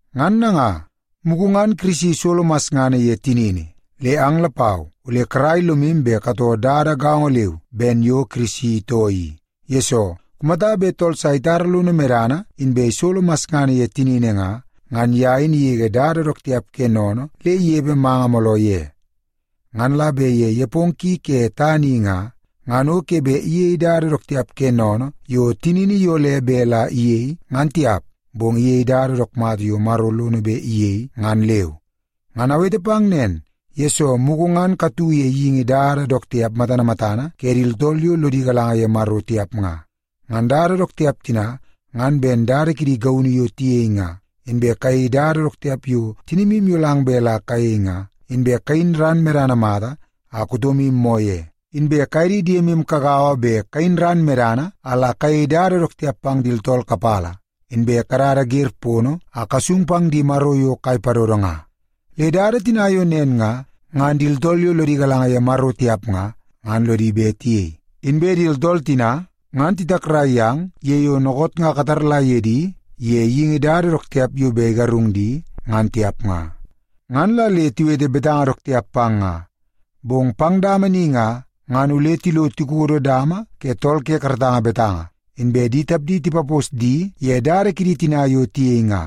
Ngan nanga, mugu ngan Kirisi isolo masngana ye tinini, le ang lapau ole karai lomu bet katoo dada gaongo leu ben yo Kirisi itoo i, yesoo kumata bet tool sa itara lono medana inbe isolo masngana ye tinini nga, ngan ye in igege dada dook tiap ke sennene le inepe manga mooloo ye. Ngan la bet ye nepongo ki ke tana i nga, ngan o ke bet iyei dada dook tiap ke sennene yo tinini iyole bet la iyei ngan tiap, bong iyei dada dook mata yo Maro lono bet iyei ngan leu. Ngan awete pang nen, yesoo mugu ngan katu ye geingi dada dook tiap matana matana ke di tooltool yo lodi galanga ye Maro tiap nga. Ngan dada dook tiap tina, ngan ben dada kidi gaunu yo tiyei nga, inbe kayei dada dook tiap yo tinimu iyolang bet la kayei nga, inbe kayin ran medana mata a kutomu moo ye, inbe kaye di diemu kagaua bet kayin ran medana a la kayei dada dook tiap pang di tooltool kapala, inbe kadada wer pono a kasung pang di maro yo kai padodo nga. Le dada tina yo nen nga, ngan di tooltool yo lodi galanga ye Maro tiap nga, ngan lodi bet tiyei. Inbe di tooltool tina, ngan titakrai yang ye yo dookoot nga kataula ye di ye geingi dada dook tiap yo bet igarung di, ngan tiap nga. Ngan la le tiwete betanga dook tiap pang nga. Bong pang dama ni nga, ngan ole tilo tikodo dama ke tool ke karatanga betanga, inbe di tapdi tipapos di ye dada kidi tina yo tiyei nga.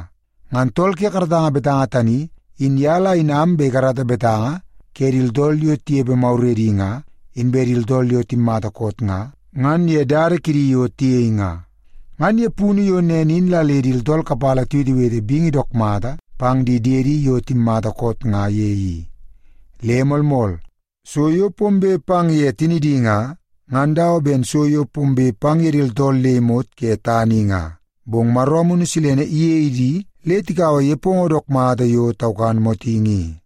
Ngan tool ke karatanga betanga tani, in ye la inam bet ikarata betanga ke di tooltool yo tinepe maguredi nga, inbe di tooltool yo timmata koot nga, ngan ye dada kidi yo tiyei nga. Ngan ye punu yo nen in la le di tooltool kapala tiwetewete bingi dook mata pang di diedi yo timmata koot nga ye i. Le moolmool, so yo pombe pang ye tinidi nga, ngan dawa ben so yo pombe pang ye di tooltool le imot ke tana i nga, bong Maro Amunu Silene iyei di le tikaua nepongo dook mata yo taukan motingi i.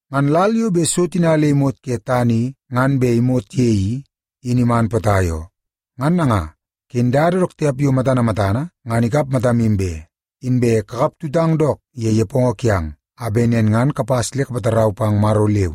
Ngan lal yo bet so tina le imot ke tana i ngan bet imot ye i, in iman potai oo. Ngan nanga, ken dada dook tiap yo matana matana ngan ikap matamu be, inbe kakaptutang dook ye nepongo kiang, a bet nen ngan kapas le kapatarau pang Maro leu.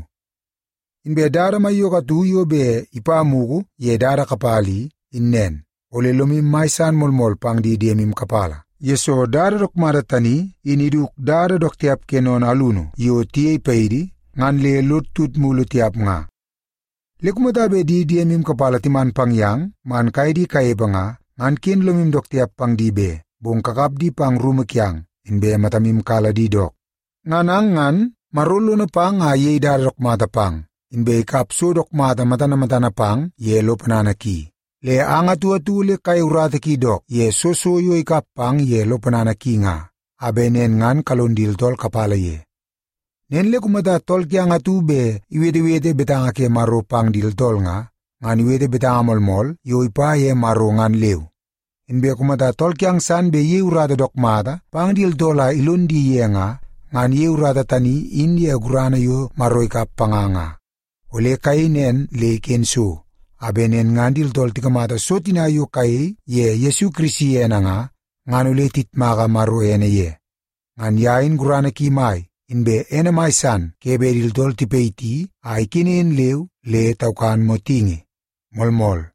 Inbe dada maiyoko atu yo bet ipa mugu ye dada kapala i, in nen. Ole lomu mai san moolmool pang di diemu kapala, yesoo dada dook mata tani, in iduk dada dook tiap ke sennene alunu yo tiyei paidi, ngan le lod tut mulu tiap nga. Le kumata bet di diemu kapala timan pang yang man kaye di kanepe nga, ngan ken lomu dook tiap pang di be, bong kakap di pang rumu kiang, inbe matamu kala di dook. Ngan ang ngan, Maro lono pang a iyei dada dook mata pang, inbe ikap so dook mata matana matana pang ye lo ponana ki. Le ang atu atu ole kayei urata ki dook ye soo so yo ikap pang ye lo ponana ki nga, a bet nen ngan kalon di tooltool kapala ye. Nen le kumata tool kiang atu bet iwetewete betanga ke Maro pang di tooltool nga, ngan iwete betanga moolmool yo ipa ye Maro ngan leu. Inbe kumata tool kiang san bet iyei urata dook mata pang di tooltool a ilon di ye nga, ngan iyei urata tani in ye gurana yo Maro ikap panga nga. Ole kayei nen le iken so, a bet nen ngan di tooltool tikamata so tina yo kayei ye Yesu Kirisi ene nga, ngan ole tiyitmaka Maro ene ye. Ngan ye in gurana ki mai, inbe ene mai san ke bet di tooltool tipayiti a ikenen leu le taukan motingi. Moolmool.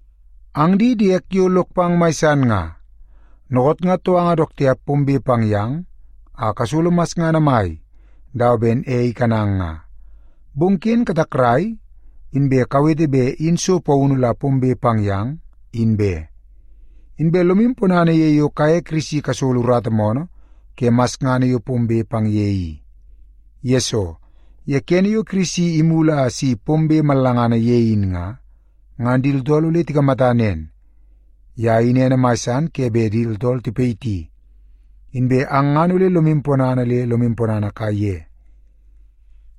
Ang di diek yo lok pang mai san nga, dookoot nga touanga dook tiap pombe pang yang a kasolo masngana mai dawa ben ei ikanang nga. Bong ken katakrai inbe kawete bet in so paunu la pombe pang yang, in be. Inbe lomu ponana ye yo kaye Kirisi kasolo urata moonoo ke masngana yo pombe pang ye i. Yesoo, ye kene yo Kirisi imulu a si pombe mallangana ye in nga, ngan di tooltool ole tikamata nen, ye in ene mai san ke bet di tooltool tipayiti, inbe ang ngan ole lomu ponana le lomu ponana kaiye.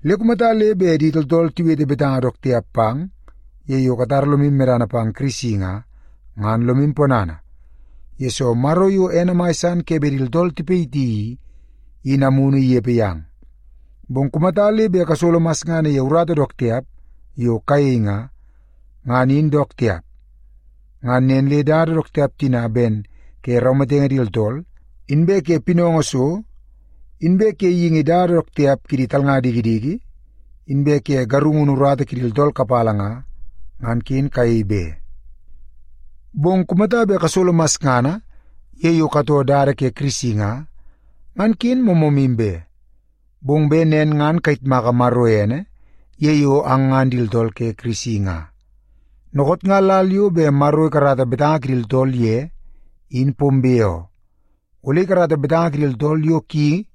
Le kumata le bet di tooltool tiwete betanga dook tiap pang ye yo katara lomu medana pang Kirisi nga, ngan lomu ponana, yesoo Maro yo ene mai san ke bet di tooltool tipayiti i, in Amunu inepe yang. Bong kumata le bet kasolo masngana ye urata dook tiap yo kayei nga, ngan in dook tiap. Ngan nen le dada dook tiap tina ben ke raumatenge di tooltool, inbe ke pinaungu so, inbe ke geingi dada dook tiap kidi talnga dikidiki, inbe ke garungunu urata kidi tooltool kapala nga, ngan ken kayei be. Bong kumata bet kasolo masngana ye yo katoo dada ke Kirisi nga, ngan ken moomoomu be. Bong bet nen ngan kayitmaka Maro ene ye yo ang ngan di tooltool ke Kirisi nga. Dookoot nga lal yo bet Maro ikarata betanga kidi tooltool ye in pombe oo. Ole ikarata betanga ke di tooltool yo ki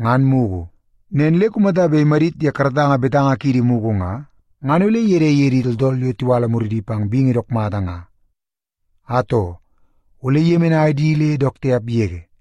ngan mugu. Nen le kumata bet imadit ye karatanga betanga kiidi mugu nga, ngan ole gelei ye di tooltool yo tiwala muridi pang bingi dook mata nga? Atoo, ole iyemenai di le dook tiap yege.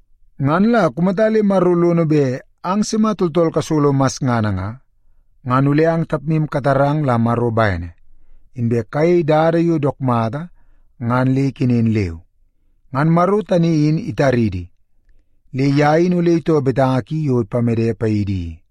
Ngan la kumata le Maro lono bet ang sima tooltool kasolo masngana nga, ngan ole ang tapmu katarang la Maro bene, inbe kayei dada yo dook mata ngan le ikenen leu. Ngan Maro tani in itaridi, le ye in ole itoo betanga ki yo ipamede paidi i.